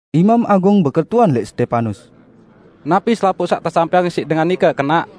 Imam Agung beketuan lẽq Stepanus, "Napi selapuq saq tesampẽang siq dengan nike kenaq?"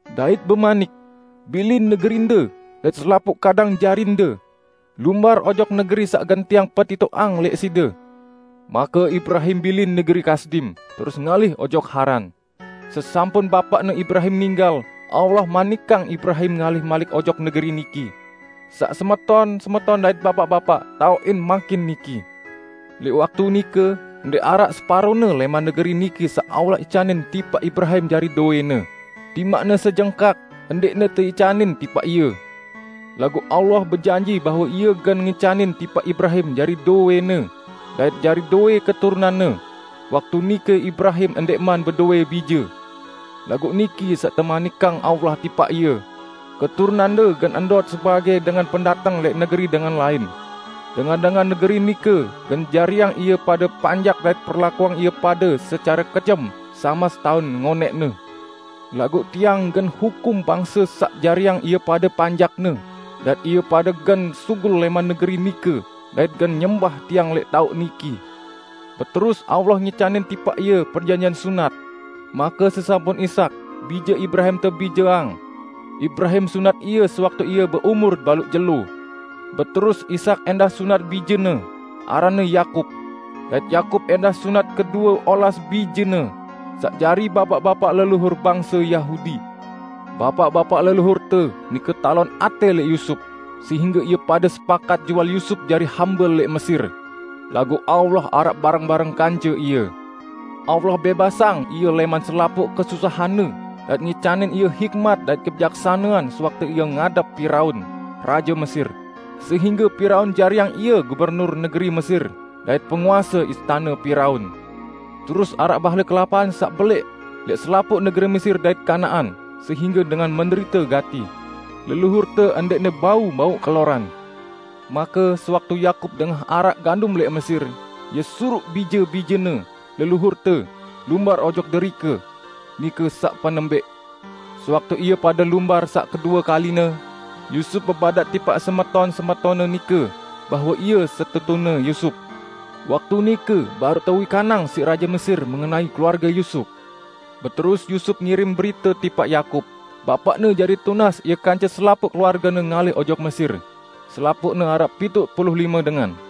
dait bemanik, 'Bilin negerinde dait selapuq kadang jarinde. Lumbar ojok negeri saq gen Tiang petitoqang lẽq side.' Make Ibrahim bilin negeri Kasdim, terus ngalih ojok Haran. Sesampun bapaqne Ibrahim ninggal, Allah manikang Ibrahim ngalih malik ojok negeri niki, saq semeton-semeton dait bapaq-bapaq taoqin mangkin niki. Lẽq waktu nike ndẽq araq separone lẽman negeri niki saq Allah icanin tipaq Ibrahim jari dowẽne, timaqne sejengkak, ndẽqne teicanin tipaq ie. Laguq Allah bejanji bahwe Ie gen ngicanin tipaq Ibrahim jari dowẽne dait jari dowẽ keturunanne. Waktu nike Ibrahim ndẽqman bedowẽ bije. Laguq niki saq temanikang Allah tipaq ie, 'Keturunande gen ndot sebagẽ dengan pendateng lẽq negeri dengan lain. Dengan-dengan negeri nike gen jariang ie pade panjak dait perlakuang ie pade secare kejem samas taun ngonẽqne. Laguq Tiang gen hukum bangse saq jariang ie pade panjakne, dait ie pade gen sugul lẽman negeri nike dait gen nyembah Tiang lẽq taoq niki.' Beterus Allah ngicanin tipaq ie perjanjian sunat. Make sesampun Ishak, bije Ibrahim tebijeang, Ibrahim sunat ie sewaktu ie beumur baluq jelo. Beterus Ishak ẽndah sunat bijene, aranne Yakub. Dait Yakub ẽndah sunat kedue olas bijene, saq jari bapaq-bapaq leluhur bangse Yahudi. Bapaq-bapaq leluhurte nike talon atẽ lẽq Yusup, sehingge ie pade sepakat jual Yusup jari hambe lẽq Mesir. Laguq Allah araq bareng-bareng kance ie, Allah bẽbasang ie lẽman selapuq kesusahanne dait ngicanin ie hikmat dait kebijaksanean sewaktu ie ngadep Piraun, raje Mesir, sehingge Piraun jariang ie gubernur negeri Mesir dait penguase istane Piraun. Terus araq bahle kelapahan saq belẽq lẽq selapuq negeri Mesir dait Kanaan sehingge dengan menderite gati. Leluhurte ndẽqne bau mauq keloran. Make sewaktu Yakub dengah araq gandum lẽq Mesir, ie suruq bije-bijene, leluhurte, lumbar ojok derike. Nike saq penembẽq. Sewaktu ie pade lumbar saq kedue kaline, Yusup bebadaq tipaq semeton-semetonne nike bahwe ie setetune Yusup. Waktu nike baruq tewikanang siq raje Mesir mengenai keluarge Yusup. Beterus Yusup ngirim berite tipaq Yakub, bapaqne jari tunas ie kance selapuq keluargene ngalih ojok Mesir -- selapuqne araq pituq pulu lime dengan.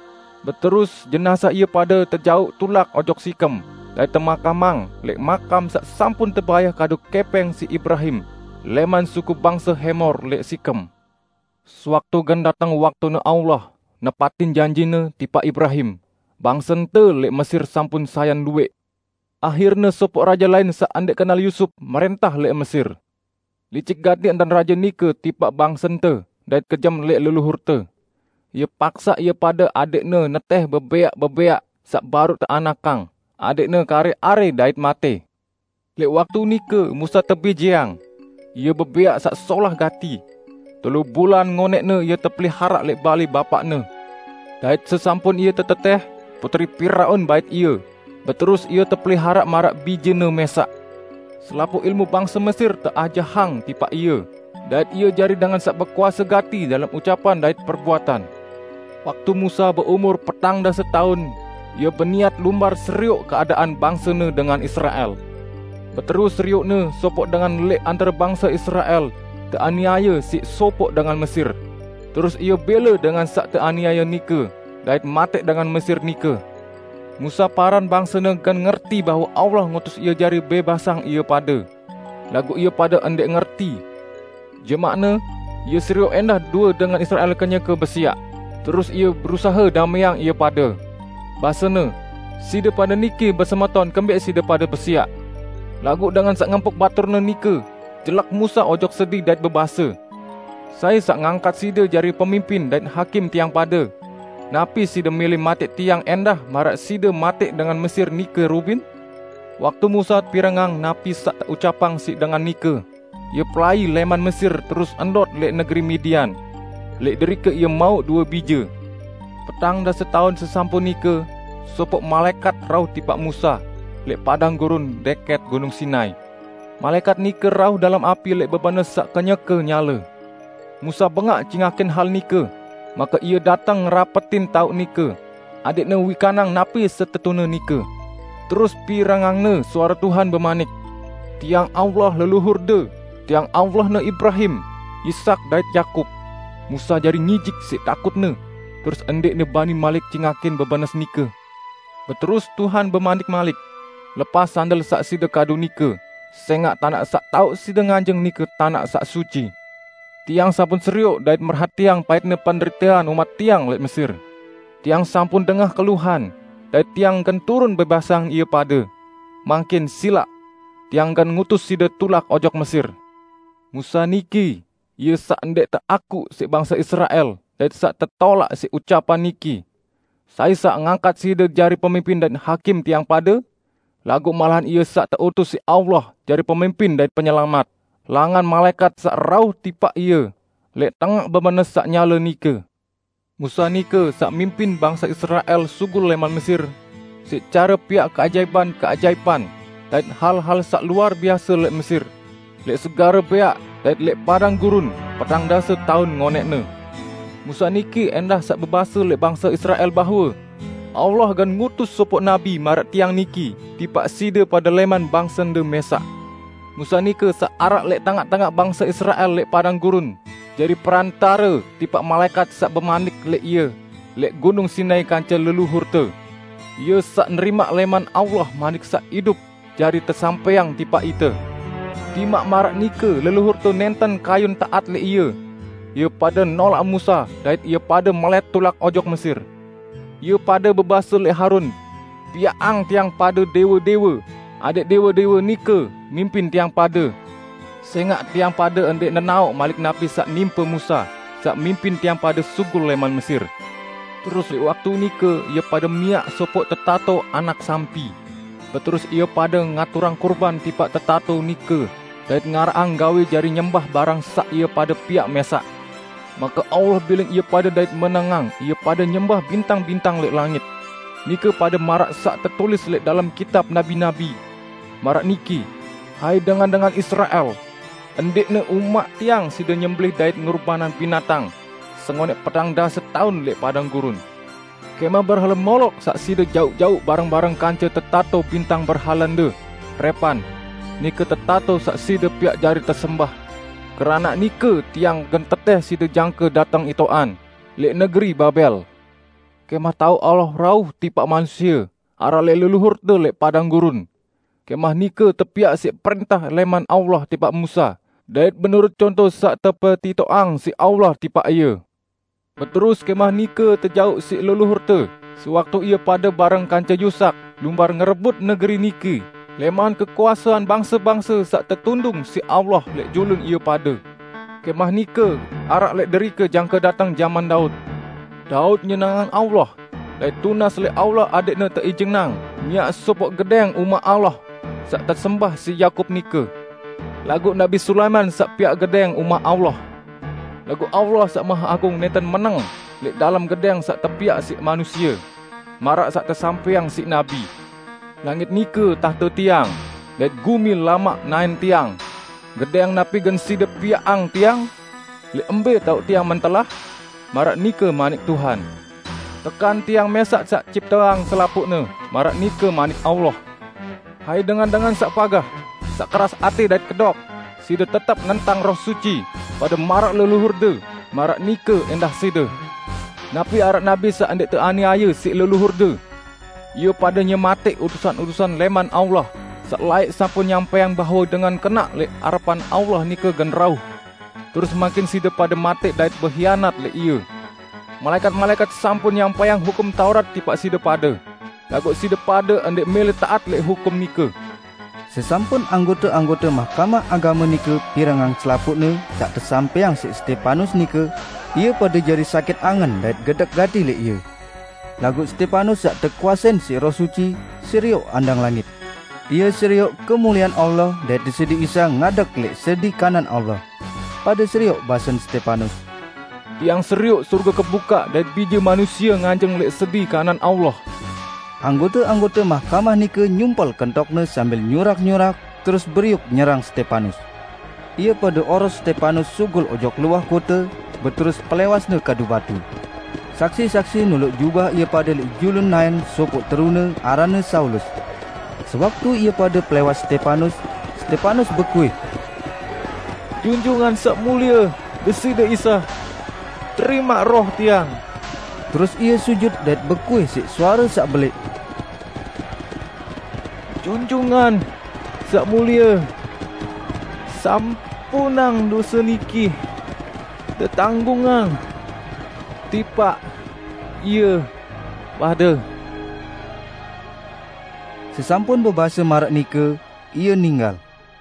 Beterus jenazah ie pade tejauq tulak ojok Sikem dait temakamang lẽq makam saq sampun tebayah kadu kẽpẽng siq Ibrahim lẽman suku bangse Hemor lẽq Sikem. Sewaktu gen dateng waktune Allah nepatin janji-Ne tipaq Ibrahim, bangsente lẽq Mesir sampun sayan luwẽq. Ahirne sopoq raje lain saq ndẽq kenal Yusup, mrẽntah lẽq Mesir. Licik gati entan raje nike tipaq bangsente dait kejem lẽq leluhurte. Ie paksaq ie pade adẽqne netẽh bebẽaq-bebẽaq saq baruq teanakang, adẽqne karẽ-arẽ dait matẽ. Lẽq waktu nike Musa tebijeang; ie bebẽaq saq solah gati. Telu bulan ngonẽqne ie tepeliharaq lẽq balẽ bapaqne, dait sesampun ie tetetẽh, putri Piraun bait ie, beterus ie tepeliharaq maraq bijene mẽsaq. Selapuq ilmu bangse Mesir teajahang tipaq ie dait ie jari dengan saq bekuase gati dalem ucapan dait perbuatan. Waktu Musa beumur petang dase taun, ie beniat lumbar serioq keadaan bangsene dengan Israel. Beterus serioqne sopoq dengan lẽq antare bangse Israel teaniaye siq sopoq dengan Mesir; terus ie bẽle dengan saq teaniaye nike, dait matẽq dengan Mesir nike. Musa paran bangsene gen ngerti bahwe Allah ngutus ie jari bẽbasang ie pade. Laguq ie pade ndẽq ngerti. Jemaqne, ie serioq ẽndah due dengan Israel kenyeke besiaq, terus ie berusahe damẽang ie pade. Basene, 'Side pade niki besemeton kembẽq side pade besiaq?' Laguq dengan saq ngempuk baturne nike jelek Musa ojok sedi dait bebase, 'Sai saq ngangkat side jari pemimpin dait hakim tiang pade? Napi side mẽlẽ matẽq tiang ẽndah maraq side matẽq dengan Mesir nike rubin?' Waktu Musa pirengang napi saq teucapang siq dengan nike, ie pelai lẽman Mesir terus ndot lẽq negeri Midian. Lẽq derike ie mauq due bije. Petang dase taun sesampun nike sopoq malaẽkat rauh tipaq Musa lẽq padang gurun dẽkẽt Gunung Sinai. Malaẽkat nike rauh dalem api lẽq bebenes saq kenyeke nyale. Musa bengaq cingakin hal nike, make ie dateng ngerapetin taoq nike adẽqne wikanang napi setetune nike. Terus pirengangne suare Tuhan bemanik, 'Tiang Allah leluhurde, Tiang Allahne Ibrahim, Ishak dait Yakub.' Musa jari ngijik siq takutne, terus ndẽqne bani malik cingakin bebenes nike. Beterus Tuhan bemanik malik, 'Lepas sandel saq side kadu nike, sẽngaq tanaq saq taoq side nganjeng nike tanaq saq suci. Tiang sampun serioq dait merhatiang paitne penderitean umat Tiang, lẽq Mesir. Tiang sampun dengah keluhan, dait Tiang gen turun bẽbasang ie pade. Mangkin, silaq! Tiang gen ngutus side tulak ojok Mesir.' Musa niki ie saq ndẽq teakuq siq bangse Israel dait saq tetolaq siq ucapan niki, 'Sai saq ngangkat side jari pemimpin dait hakim tiang pade?' Laguq malahan ie saq teutus siq Allah jari pemimpin dait penyelamat, langan malaẽkat saq rauh tipaq ie lẽq tengaq bebenes saq nyale nike. Musa nike saq mimpin bangse Israel sugul lẽman Mesir siq care piaq keajaipan-keajaipan dait hal-hal saq luar biase lẽq Mesir, lẽq Segare Bẽaq dait lẽq padang gurun petang dase taun ngonẽqne. Musa niki ẽndah saq bebase lẽq bangse Israel bahwe, 'Allah gen ngutus sopoq nabi maraq tiang niki tipaq side pade lẽman bangsende mẽsaq.' Musa nike saq araq lẽq tengaq-tengaq bangse Israel lẽq padang gurun, jari perantare tipaq malaẽkat saq bemanik lẽq ie lẽq Gunung Sinai kance leluhurte. Ie saq nerimaq lẽman Allah manik saq idup jari tesampẽang tipaq ite. Timaq maraq nike leluhurte nẽnten kayun taat lẽq ie. Ie pade nolaq Musa dait ie pade melẽt tulak ojok Mesir. Ie pade bebase lẽq Harun, 'Piaqang tiang pade dẽwe-dẽwe, adẽq dẽwe-dẽwe nike mimpin tiang pade. Sẽngaq tiang pade ndẽq nenaoq malik napi saq nimpe Musa, saq pimpin tiang pade sugul lẽman Mesir!' Terus lẽq waktu nike ie pade miaq sopoq tetato anak sampi, beterus ie pade ngaturang kurban tipaq tetato nike dait ngaraqang gawẽ jari nyembah barang saq ie pade piaq mẽsaq. Make Allah bilin ie pade dait menengang ie pade nyembah bintang-bintang lẽq langit. Nike pade maraq saq tetulis lẽq dalem kitab nabi-nabi. Maraq niki, 'Hai dengan-dengan Israel! Ndẽqne umaq Tiang side nyembelẽh dait ngurbanang binatang sengonẽq petang dase taun lẽq padang gurun. Kẽmah berhale Molok saq side jauq-jauq bareng-bareng kance tetato bintang berhalende, Repan; nike tetato saq side piaq jari tesembah. Keranaq nike Tiang gen tetẽh side jangke dateng itoqan, lẽq negeri Babel.' Kẽmah taoq Allah rauh tipaq manusie araq lẽq leluhurte lẽq padang gurun. Kẽmah nike tepiaq siq prẽntah lẽman Allah tipaq Musa dait menurut conto saq tepetitoqang siq Allah tipaq ie. Beterus kẽmah nike tejauq siq leluhurte sewaktu ie pade bareng kance Yusak lumbar ngerebut negeri niki lẽman kekuasean bangse-bangse saq tetundung siq Allah lẽq julun ie pade. Kẽmah nike araq lẽq derike jangke dateng jaman Daud. Daud nyenengang Allah, dait tunas lẽq Allah adẽqne teijinang miaq sopoq gedẽng umaq Allah saq tesembah siq Yakub nike. Laguq Nabi Sulaiman saq piaq gedẽng umaq Allah. Laguq Allah saq Maheagung nẽnten meneng lẽq dalem gedẽng saq tepiaq siq manusie; maraq saq tesampẽang siq nabi, 'Langit nike tahte Tiang, dait gumi lamak naẽn Tiang. Gedẽng napi gen side piaqang Tiang? Lẽq mbẽ taoq Tiang mentelah? Maraq nike manik Tuhan. Tekan Tiang mẽsaq saq cipteang selapuqne?' maraq nike Manik Allah. Hai dengan-dengan saq pagah, saq keras atẽ dait kedok, side tetep nentang Roh Suci, pade maraq leluhurde, maraq nike ẽndah side. Napi araq nabi saq ndẽq teaniaye siq leluhurde? Ie pade nyematẽq utusan-utusan lẽman Allah saq laẽq sampun nyampẽang bahwe Dengan Kenaq lẽq arepan Allah nike gen rauh. Terus mangkin side pade matẽq dait behianat lẽq Ie. Malaẽkat-malaẽkat sampun nyampẽang Hukum Taurat tipaq side pade, laguq side pade ndẽq mẽlẽ taat lẽq hukum nike!" Sesampun anggote-anggote Mahkamah Agame nike pirengang selapuqne saq tesampẽang siq Stepanus nike, ie pade jari sakit angen dait gedek gati lẽq ie. Laguq Stepanus saq tekuasein siq Roh Suci, serioq andang langit. Ie serioq kemuliean Allah dait Deside Isa ngadeg lẽq sedi kanan Allah. Pade serioq basen Stepanus, "Tiang serioq sorge kebukaq dait Bije Manusie nganjeng lẽq sedi kanan Allah!" Anggote-anggote mahkamah nike nyumpel kentokne sambil nyurak-nyurak, terus beriuk nyerang Stepanus. Ie pade oros Stepanus sugul ojok luah kote, beterus pelẽwasne kadu batu. Saksi-saksi noloq jubah ie pade lẽq julun naẽn sopoq terune aranne Saulus. Sewaktu ie pade pelẽwas Stepanus, Stepanus bekuih, "Junjungan Saq Mulie Deside Isa, terimaq roh tiang!" Terus ie sujut dait bekuih siq suare saq belẽq, "Junjungan Saq Mulie, sampunang dose niki tetanggungang tipaq ie pade!" Sesampun bebase maraq nike, ie ninggal.